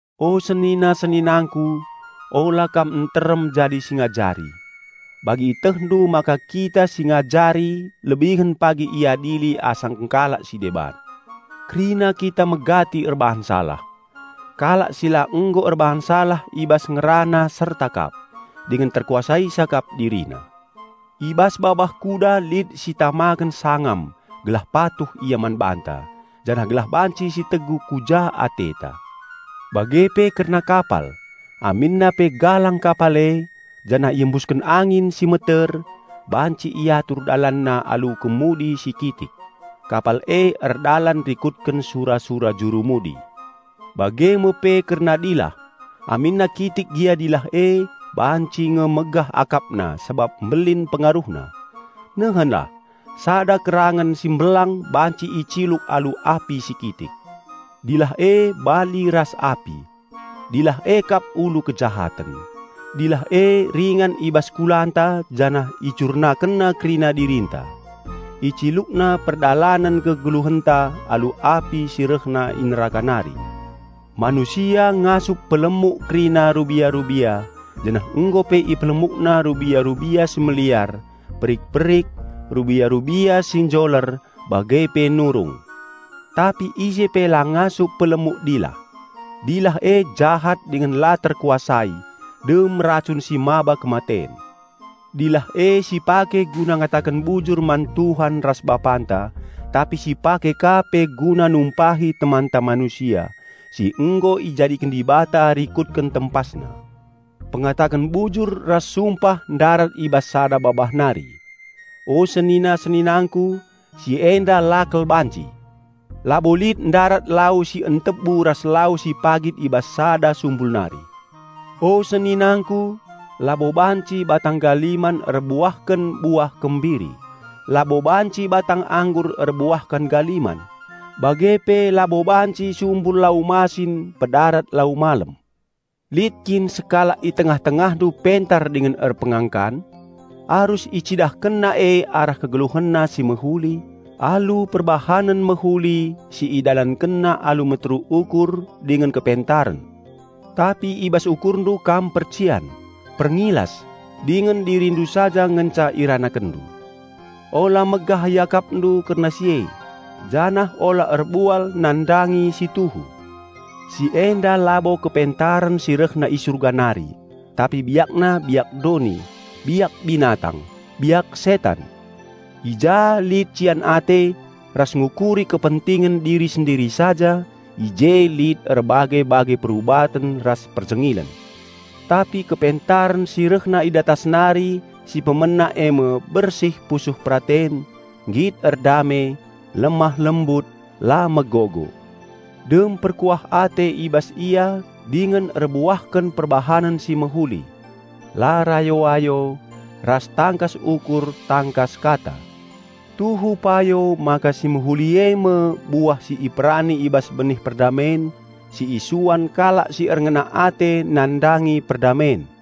O senina-seninangku, ula kam nterem jadi si ngajari. Bagi ietehndu maka kita si ngajari lebihen pagi iadili asangken kalak si deban. Kerina kita megati erbahan salah. Kalak si la nggo erbahan salah i bas ngerana serta kap, dingen terkuasaina kap dirina. I bas babah kuda lit sitamaken sangam gelah patuh ia man banta janah gelah banci sitegu ku ja ateta. Bage pe kerna kapal, aminna pe galang kapal e, janah iembusken angin si meter, banci iatur dalanna alu kemudi si kitik. Kapal e erdalan rikutken sura-sura jurumudi. Bage me pe kerna dilah, aminna kitik gia dilah e, banci nge megah akapna sabap mbelin pengaruhna. Nehenlah, sada kerangen si mbelang banci iciluk alu api si kitik. Dilah e bali ras api. Dilah e kap ulu kejahaten. Dilah e ringan i bas kulanta janah icurnakenna kerina dirinta. Icilukna perdalanen kegeluhenta alu api si rehna i neraka nari. Manusia ngasup pelemuk kerina rubia-rubia, janah nggo pe ipelemukna rubia-rubia si meliar, perik-perik, rubia-rubia si njoler, bage pe nurung. Tapi ise pe la ngasup pelemuk dilah. Dilah e jahat dingen la terkuasai, dem racun si maba kematen. Dilah e sipake guna ngataken bujur man Tuhan ras Bapanta, tapi sipake ka pe guna numpahi temanta manusia, si nggo ijadiken Dibata rikutken TempasNa. Pengataken bujur ras sumpah ndarat i bas sada babah nari. O senina-seninangku, si enda la kal banci! Labo lit ndarat lau si entebu ras lau si pagit i bas sada sumbul nari. O seninangku, labo banci batang galiman erbuahken buah kembiri; labo banci batang anggur erbuahken galiman; bage pe labo banci sumbul lau masin pedarat lau malem. Lit kin sekalak i tengah-tengahndu pentar dingen erpengangkan? Arus icidahkenna e arah kegeluhenna si mehuli, alu perbahanen mehuli si idalankenna alu meteruk ukur dingen kepentaren. Tapi i bas ukurndu kam percian, perngilas, dingen dirindu saja ngenca iranakenndu. Ula megah iakapndu kerna si e, janah ula erbual nandangi si tuhu. Si enda labo kepentaren si rehna i Surga nari, tapi biakna biak doni, biak binatang, biak setan. I ja lit cian ate, ras ngukuri kepentingen diri sendiri saja, i je lit erbage-bage perubaten ras perjengilen. Tapi kepentaren si rehna i datas nari si pemena e me bersih pusuh peraten, nggit erdame, lemah lembut, la megogo. Dem perkuah ate i bas ia dingen erbuahken perbahanen si mehuli. La rayo-ayo, ras tangkas ukur tangkas kata. Tuhu payo maka si mehuli e me buah si iperani i bas benih perdamen si isuan kalak si erngena ate nandangi perdamen.